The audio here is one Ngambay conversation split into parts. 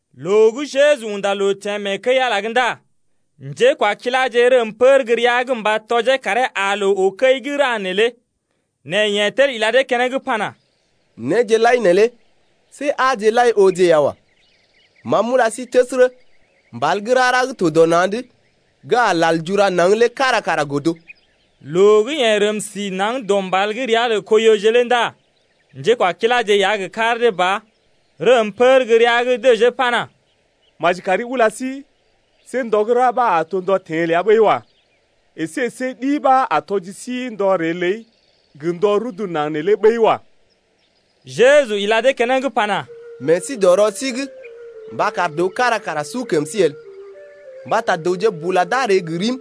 Loo gə́ Jeju unda loo teḛ mee kəi-Ala’g ndá njékwakiláje rəm pər gə́ rəa’g mba tɔjee karee aa loo oo kəi gə́ ra neelé. Nɛ yeḛ tel ila dee keneŋ pana: Néje lai neelé see aaje lai ooje ya wa. Ma m’ula sí təsərə, mbal gə́ rara gə́ to dɔ na̰’d gə́ a lal jura naŋg el lé kára kara godo. Loo gə́ yeḛ rəm si naŋg dɔ mbal gə́ ria lə Koiyoje lé ndá njékwakiláje ya gə kar dee ba rəm pər gə́ rəa’g dəjee pana: Maji kari ula sí, see ndɔ gə́ ra ɓa a to ndɔ teḛ ləa ɓəi wa. Esé see ɗi ɓa a tɔji sí ndɔ ree ləi gə ndɔ rudu naŋg nee lé ɓəi wa. Jeju ila dee keneŋ pana: Meḛ sí dɔ rɔ sí’g mba kar dəw kára kara su kəm sí el. Mbata dəwje bula d’a ree gə rim,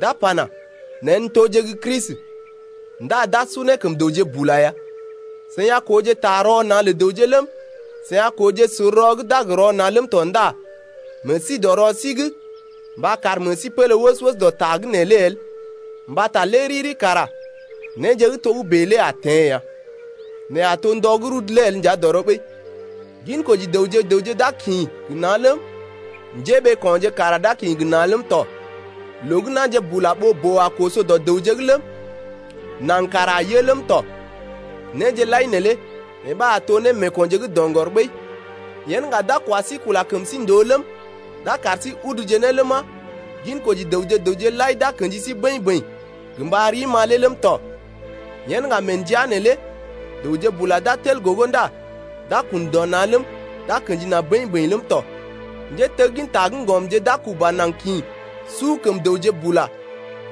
d’a pana: Neḛ n’toje gə́ Kristi. Ndá d’a su ne kəm dəwje bula ya. Seḭ a kooje ta rɔ na̰ lə dəwje ləm, seḭ a kooje sor rɔ gə́ d’a gə rɔ na̰ ləm tɔ ndá meḛ sí to dɔ rɔ sí’g mba kar meḛ sí pélé wəs-wəs dɔ ta’g neelé el mbata lé riri kara néje gə́ togə́bè lé a teḛ ya. Nɛ a to ndɔ gə́ rudu lé el nja dɔrɔ ɓəi. Ginkoji dəwje gə raŋg d’a kḭ gə na̰ ləm, njéɓeeko̰je kara d’a kḭ gə na̰ ləm tɔ. Loo gə́ na̰je bula ɓoo-boo a koso dɔ dəwje’g ləm, naŋg kara a yə ləm tɔ. Néje lai neelé yee ɓa a to némeekonje gə́ doŋgɔr ɓəi. Yen ŋga d’a kwa sí kula kəm sí ndòo ləm, d’a kar sí uduje ne ləma, ginkoji dəwje gə raŋg lai d’a kḛji sí bəḭ-bəḭ gə mba rim-ma lé ləm tɔ. Yen ŋga mee ndəa’g neelé dəwje bula d’a tel gogo ndá d’a kun dɔ na̰ ləm, d’a kḛji na̰ bəḭ-bəḭ ləm tɔ. Njétegginta gə́ ŋgɔmje d’a kuba naŋg kḭ su kəm dəwje bula.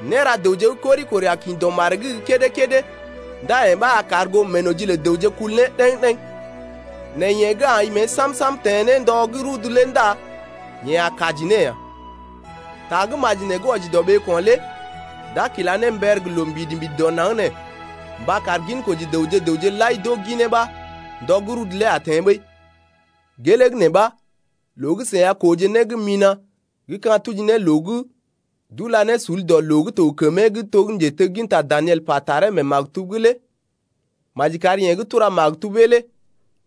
Néra dəwje gə́ kori-kori a kḭ dɔ maree’g gə́ kédé-kédé ndá yee ɓa a kar goo meenoji lə dəwje kul ne ɗəŋ-ɗeŋ. Nɛ yeḛ gə́ ai mée sam-sam teḛ ne ndɔ gə́ rudu’g lé ndá yeḛ a kaji ne ya. Ta gə́ maji nee gə́ wɔji dɔ ɓeeko̰ lé d’a kila ne mber gə loo mbidi-mbidi dɔ naŋg nee mba kar ginkoji dəwje gə raŋg lai d’oo ginee ɓa ndɔ gə́ rudu lé a teḛ ɓəi. Gelee gə́ nee ɓa loo gə́ seḭ a kooje né gə́ mina̰ gə́ ka̰ tuji ne loo gə́ d’ula ne sul dɔ loo gə́ to gə kəmee to gə́ njetegginta Daniel pa taree mee maktub’g lé (maji kar yeḛ gə́ tura maktubee lé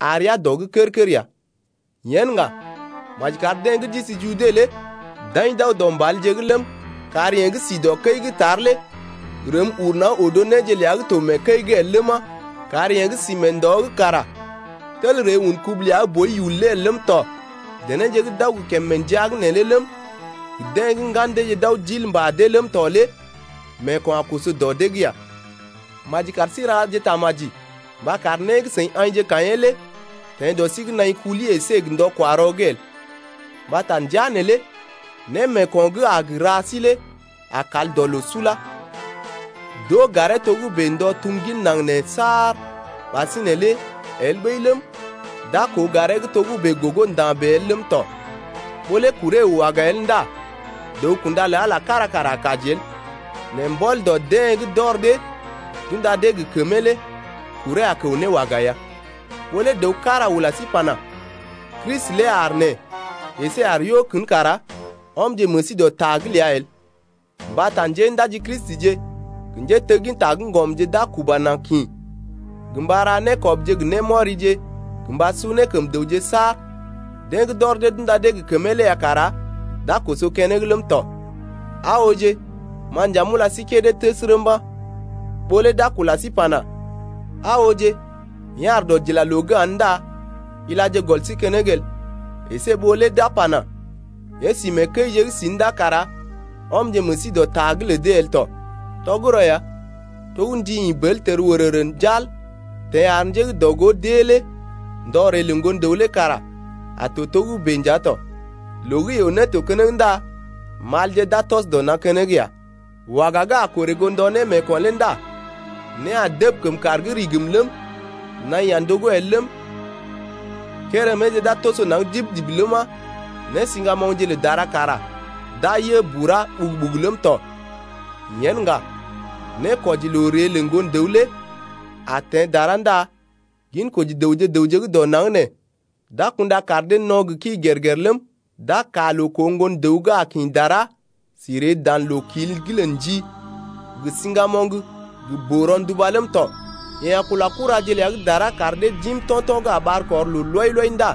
aa rəa dɔ’g kər-kər ya.) Yen ŋga maji kar deḛ gə́ d’isi Jude lé d’aḭ d’aw dɔ mbalje’g ləm, kar yeḛ gə́ si dɔ kəi’g tar lé rəm uru naŋg odo néje ləa gə́ to mee kəi’g el ləma 8kar yeḛ gə́ sí mee ndɔ’g kara tel ree un kubu ləa gə́ boi yul lé el ləm tɔ. Denéje gə́ d’aw gə kèm mee ndəa’g neelé ləm, gə deḛ gə́ ŋgan deeje d’aw d’il mbà dee’g ləm tɔ lé meeko̰ a koso dɔ dee’g ya. Maji kar sí raje tamaji mba kar né gə́ seḭ aḭje kaḭyee lé teḛ dɔ sí’g nai kuli əsé gə ndɔ-kwa-rɔ’g el. Mbata ndəa neelé némeeko̰ gə́ a gə ra sí lé a kal dɔ loo sula. D’oo garee togə́bè ndɔ tum gin naŋg nee saar ɓasinè lé el ɓəi ləm, d’a koo garee gə́ togə́bè gogo nda̰ bèe el ləm tɔ. Ɓó lé kuree əw waga el ndá dəw-kunda lə Ala kára kara a kaji el, nɛ mbɔl dɔ deḛ gə́ d’ɔr dee d’unda dee gə kəmee lé kuree a kəw ne waga ya. Ɓó lé dəw kára ula sí pana: Kristi lé aar nee əsé yeḛ aar yo kən kara ɔmje meḛ sí dɔ ta’g ləa el. Mbata njéndaji Kristije gə njétegginta gə́ ŋgɔmje d’a kuba na̰ kḭ gə mba ra nékɔbje gə némɔrije gə mba su ne kəm dəwje saar deḛ gə́ d’ɔr dee d’unda dee gə kəmee lé ya kara d’a koso keneŋ ləm tɔ. Aa ooje, ma nja m’ula sí kédé təsərə mba̰. Ɓó lé d’a kula sí pana: Aa ooje, yeḛ aar dɔdilaloo’g aa’n ndá ilaje gɔl sí keneŋ el. Esé ɓó lé d’a pana: Yeḛ si mee kəije’g si’n ndá kara ɔmje meḛ sí dɔ ta’g lə dee el tɔ. Tɔgərɔ ya, to gə́ ndi ḭ bər tel wərərə njal teḛ ar njé gə́ dɔ-gó d’ée lé ndɔ ree lə Ŋgon-dəw lé kara a to togə́bè nja tɔ. Loo gə́ yoo-né to keneŋ ndá malje d’a tɔs dɔ na̰ keneŋ ya. Waga gə́ a korè goo ndɔ némeeko̰ lé ndá né a dəb kəm kàr’g rigim ləm, naḭ a ndogó el ləm, kéréméje d’a toso naŋg dib-dib ləma, nésiŋgamoŋje lə dara kara d’a yə bura ɓugu-ɓugu ləm tɔ. Yen ŋga, nékwɔji loo ree lə Ŋgon-dəw lé a teḛ dara ndá ginkoji dəwje gə raŋg gə́ dɔ naŋg nee d’a kunda kaar dee no̰ gə kii gèr-gèr ləm, d’a kaa loo koo Ŋgon-dəw gə́ a kḭ dara si ree dan loo-kil’g lə ndi gə siŋgamoŋ gə boo-ronduba ləm tɔ. Yeḛ a kula kuraje ləa gə́ dara kar dee d’im to̰to̰ gə́ a ɓar kɔr loo lɔi-lɔi ndá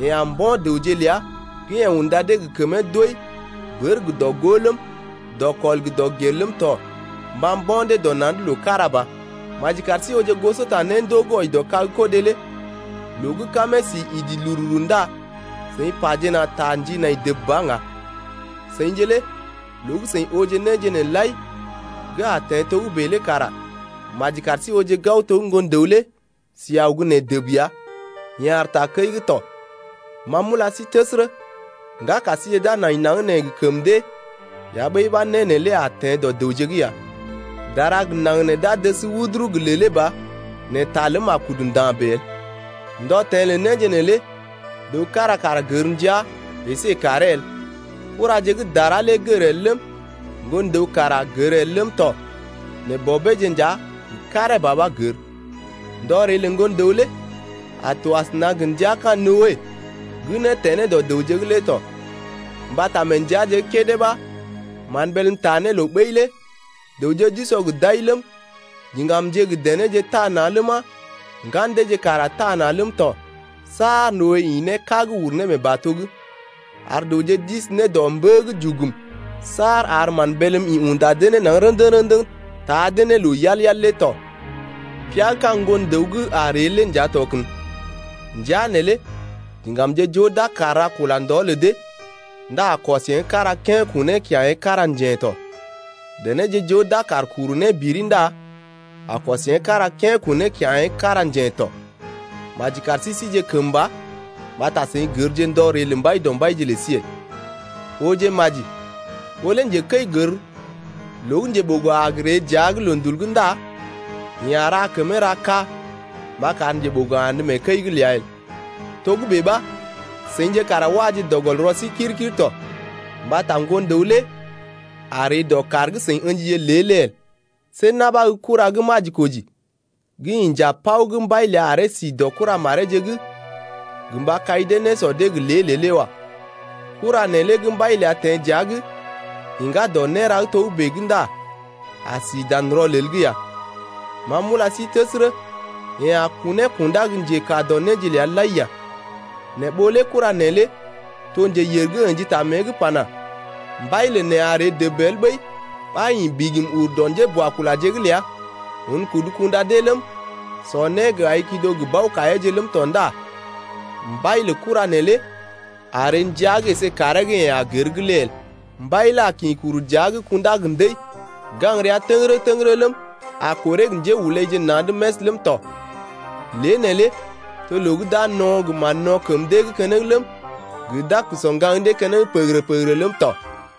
yeḛ a mbo̰ dəwje ləa gə́ yeḛ unda dee gə kəmee doi bər gə dɔ-gó ləm, dɔkɔl gə dɔgel ləm tɔ mba mbo̰ dee dɔ na̰’d loo kára ba. Maji kar sí ooje gosota néndoo gə́ wɔji dɔ kag-kodé lé. Loo gə́ kamee sí idi lururu ndá seḭ pajena ta ndi nai dəb ba ŋga. Seḭje lé loo gə́ seḭ ooje néje nee lai gə́ a teḛ togə́bè lé kara maji kar sí ooje gao to gə́ Ŋgon-dəw lé si aw gə́ nee dəb ya, yeḛ aar takəi’g tɔ. Ma m’ula sí təsərə, ŋgaka síje d’a nai naŋg nee gə kəm dee ya ɓəi ɓa né neelé a teḛ dɔ dəwje’g ya. Dara gə naŋg nee d’a dəs wuduru gə lèlé ba nɛ ta ləm a kudu nda̰ bèe el. Ndɔ teḛ lə néje neelé dəw kára kara gər ndəa əsé kàree el. Kuraje gə́ dara lé gər el ləm, Ŋgon-dəw kara gər el ləm tɔ nɛ Bɔbeeje nja gə karee ba ɓa gər. Ndɔ ree lə Ŋgon-dəw lé a to asəna gə ndəa ka̰ Noe gə́ né teḛ ne dɔ dəwje’g lé tɔ. Mbata mee ndəaje gə́ kédé ɓa mán bélm taa ne loo ɓəi lé dəwje d’usɔ gə d’ai ləm, diŋgamje gə denéje taa na̰ ləma, ŋgan deeje kara taa na̰ ləm tɔ saar Noe ḭ ne kág uru ne mee bato’g, ar dəwje d’isi ne dɔ mbə’g jugum saar ar mán bélm ḭ unda dee ne naŋg rə̰dəŋ-rə̰dəŋ taa dee ne loo yal-yal lé tɔ. Pia gə́ ka̰ Ŋgon-dəw gə́ a gə ree lé nja to kən. Ndəa neelé diŋgamje joo d’a kaar ra kula ndɔ lə dee ndá a kɔs yeḛ gə́ kára kén kunee kya̰ yee gə́ kára njèḛ tɔ. Denéje joo d’a kaar kuru né biri ndá a kɔs yeḛ gə́ kára kén kunee kya̰ yeḛ gə́ kára njèḛ tɔ. Maji kar sí sije kəmba mbata seḭ gərje ndɔ ree lə Mbaidɔmbaije lə sí el. Ooje maji, ɓó lé njekəi gər loo gə́ njeɓogo a gə ree dəa’g loondul’g ndá yeḛ a ra kəmee ra kaa mba kar njeɓogo andə mee kəi’g ləa el. Togə́bè ɓa seḭje kara waje dɔ gɔl rɔ sí kir-kir tɔ mbata Ŋgon-dəw lé a ree dɔ kàr gə́ seḭ ə̰jije lé el. See na̰ ɓa gə́ kura gə́ majikoji gə́ inja paw gə́ mbai ləa aree si dɔ kuramareeje’g gə mba kai dee nésɔ dee gə lée-lée lé wa. Kura neelé gə́ mbai ləa teḛ dəa’g iŋgá dɔ néra gə́ togə́bè’g ndá a si dan rɔlel’g ya. Ma m’ula sí təsərə, yeḛ a kunee kundá gə njekaa dɔ néje ləa lai ya. Nɛ ɓó lé kura neelé to njeyèr gə́ ə̰ji ta mée’g pana: Mbai lə neḛ a ree dəb el ɓəi, ɓa ḭ bigim ur dɔ njéboakulaje’g ləa un kudu kunda dee ləm, sɔ né gə aḭ kido gə bao-kaiyeeje ləm tɔ ndá mbai lə kura neelé a ree ndəa’g əsé kàree gə́ yeḛ a gər’g lé el. Mbai lé a kḭ kuru dəa’g kundá gə ndəi gaŋg rəa təgərə-təgərə ləm, a korè gə njéhulaije na̰’d məs ləm tɔ. Lée neelé to loo gə́ d’a no̰ gə mán-no̰ kəm dee’g keneŋ ləm, gə d’a sɔ ŋgaŋ dee keneŋ pəgərə-pəgərə ləm tɔ.